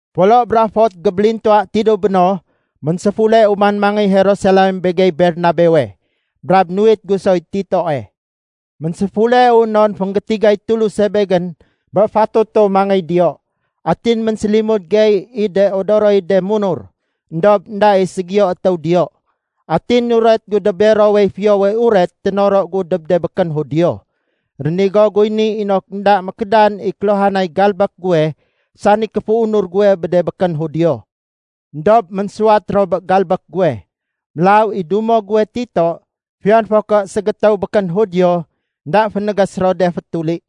Folo bra fot gébélintuwa tidéw béno, ménséfuleu man mangéy Jerusalem begey Bernabewe. Brab nuwit gu soy Titoe. Ménséfuleu non fénggétigay Tuluse begén bé fatutu mangéy diyo. Atin ménsélimud gey i de odoroy de munur, éndob énda i ségiyo étéw diyo. Atin nuret gu dob berowey Fiyowe Uret ténoro gu dob de békén Judio. Rénigo guy ni inok énda mékédan i kéluhanay galbék guwe sani kéféunur guwe bé de békén Judio. Endob ménsuwat ro bé galbék guwe. Mélaw i dumo guwe Tito, fiyon fo ké ségétéw békén Judio, énda fénégés ro de fétuli.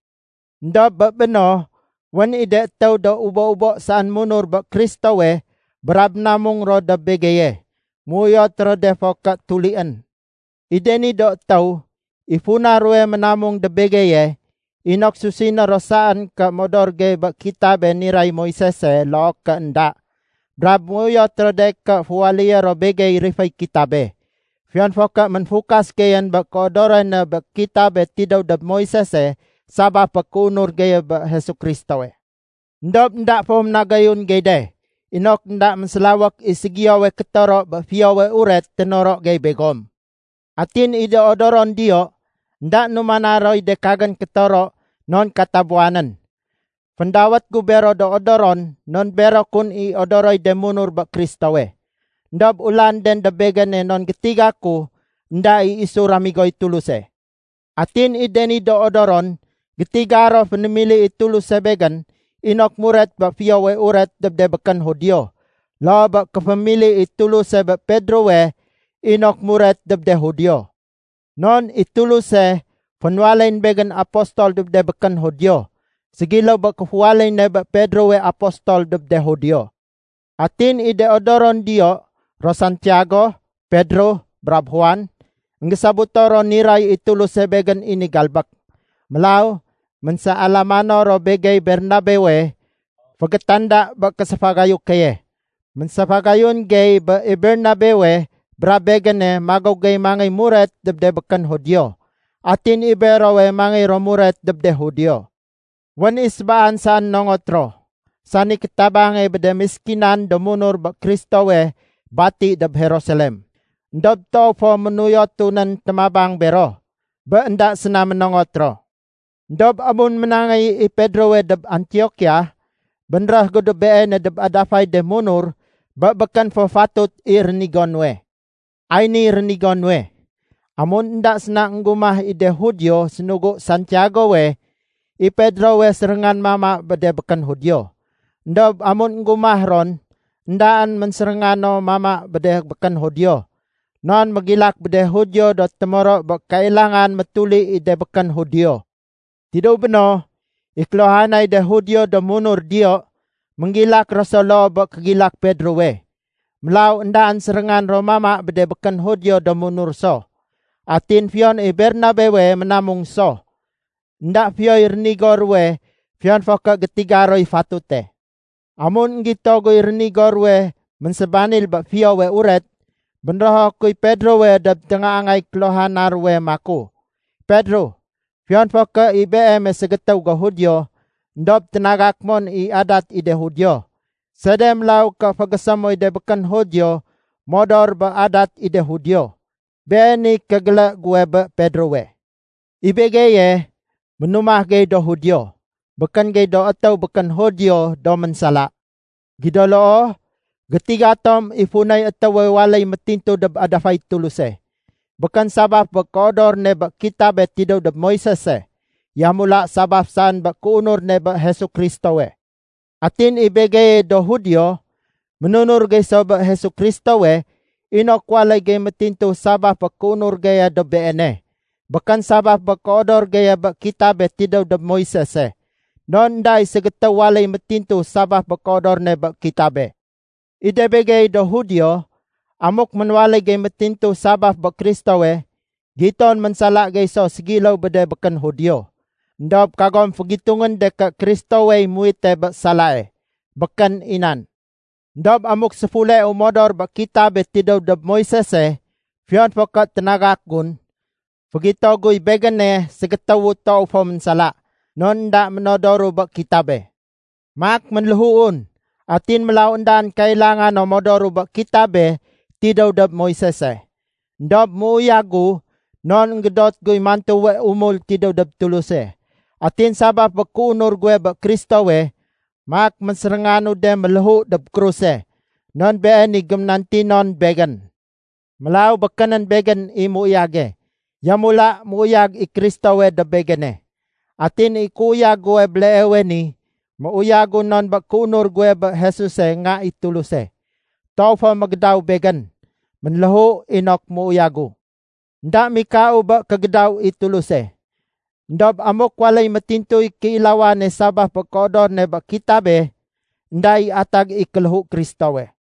Endob bé béno, wén i de étéw do ubo-ubo saén munur bé Kristowe brab ménamung ro dob begeye, méuyot ro de fo ké tulién. I de ni do étéw, i funa ruwe ménamung dob begeye, inok susiné ro saén ké modor gey bé kitabe niray Moisese loo ké énda. Brab méuyot ro de ké féwaléyé ro begey riféy kitabe, fiyon fo ké ménfukas geyén bé kéodorone bé kitabe tidéw dob Moisese sabaf bé kéunur geye bé Jesu Kristowe. Endob énda fo ménagayun gey de, inok énda mésélawék i ségiyowe kétoro bé Fiyowe Uret ténoro gey begom. Atin i de odoron diyo, énda numana roy de kagén kétoro non katabuwanén. (Féndawét gu bero do odoron non bero kun i odoroy de munur bé Kristowe. Endob ulanden dob begéne non gétiga ku énda i isu ramigoy Tuluse.) Atin i de ni do odoron gétiga ro fénémili i Tuluse begén inok muret bé Fiyowe Uret dob de békén Judio loo bé kéfémili i Tuluse bé Pedrowe inok muret dob de Judio. Non i Tuluse fénwaléyén begén apostol dob de békén Judio ségiléw bé kéféwaléy ne bé Pedrowe apostol dob de Judio. Atin i de odoron diyo ro Santiago, Pedro, brab Juan, énggésobuto ro niray i Tuluse begén i ni galbék. Mélaw ménséalamano ro begey Bernabewe fégétanda bé kégéséfagayu keye. Ménséfagayun gey bé i Bernabewe brab begéne magéw gey mangéy muret dob de békén Judio atin i berowe mangéy ro muret dob de Judio. Wén i sébaane saén nongot ro, sani kétabange bé de méskinan do munur bé Kristowe bati dob Jerusalem. Endob toow fo ménuyotu nén témabang bero, bé énda séna ménongot ro. Endob amun ménangéy i Pedrowe dob Antiokia, bénréh gu dob beene dob adafay de munur bé békén fo fatut i rénigo nuwe. Ay niy rénigo nuwe. Amun énda séna énggumah i de Judio sénugu Santiagowe, i Pedrowe séréngan mama bé de békén Judio. Endob amun énggumah ron, éndaén ménsérénga no mama bé de békén Judio. Non mégilak bé de Judio do témoro bé kailangan métuli i de békén Judio. Tidéw béno, i kéluhanay de Judio do munur diyo, ménggilak ro so loo bé kégilak Pedrowe. Mélaw éndaén séréngan ro mama bé de békén Judio do munur so. Atin fiyon i Bernabewe ménamung so. Enda fiyoy rénigo ruwe fiyon fo ké gétiga roy fatute. Amun énggito guy rénigo ruwe ménsébanil bé Fiyowe Uret, bénrého kuy Pedrowe dob téngaangay kéluhana ruwe maku, “Pedro, fiyon fo ké i beeme ségétéw go Judio, éndob ténagak mon i adat i de Judio. Sede mélaw ké fégésé moy de békén Judio modor bé adat i de Judio?” Beeniy kégélé guwe bé Pedrowe. I begeye, ménumah gey do Judio, békén gey do étéw békén Judio do ménsala. Gido loo, gétiga tom i funay étéwe waléy métintu dob adafay Tuluse. Békén sabaf bé kéodor ne bé kitabe tidéw dob Moisese. Yamula sabaf saén bé kéunur ne bé Jesu Kristowe. Atin i begeye do Judio, ménunur gey so bé Jesu Kristowe inok waléy gey métintu sabaf bé kéunur geye dob Beene. Békén sabaf bé kéodor geye bé kitabe tidéw dob Moisese. Non énda i ségétéw waléy métintu sabaf bé kéodor ne bé kitabe. I de begey do Judio, amuk ménwaléy gey métintu sabaf bé Kristowe, giton ménsala gey so ségiléw bé de békén Judio. Endob kagom fégitungén de ké Kristowey muwite bé salae. Békén i nan! Endob amuk séfuleu modor bé kitabe tidéw dob Moisese fiyon fo ké ténagak gun, fégito guy begéne ségétéwu toow fo ménsala, non énda ménodoru bé kitabe. Maak ménléhuun, atin mélaw éndaén kailanga no modoru bé kitabe tidéw dob Moisese. Endob méuyagu non énggédot guy mantuwe umul tidéw dob Tuluse. Atin sabaf bé kéunur guwe bé Kristowe, maak ménsérénganu de méléhu dob kruse, non been i géménantinon begén. Mélaw békénén begén i méuyage, yamula méuyag i Kristowe dob begéne. Atin i kéuyag guwe béleewe ni, méuyagu non bé kéunur guwe bé Jesuse Nga i Tuluse. Toow fo mégédaw begén. Ménléhu inok méuyagu. Enda mikau bé kégédaw i Tuluse. Endob amuk waléy métintuy kéilawane sabaf bé kéodor ne bé kitabe, énda i atag i kéléhu Kristowe.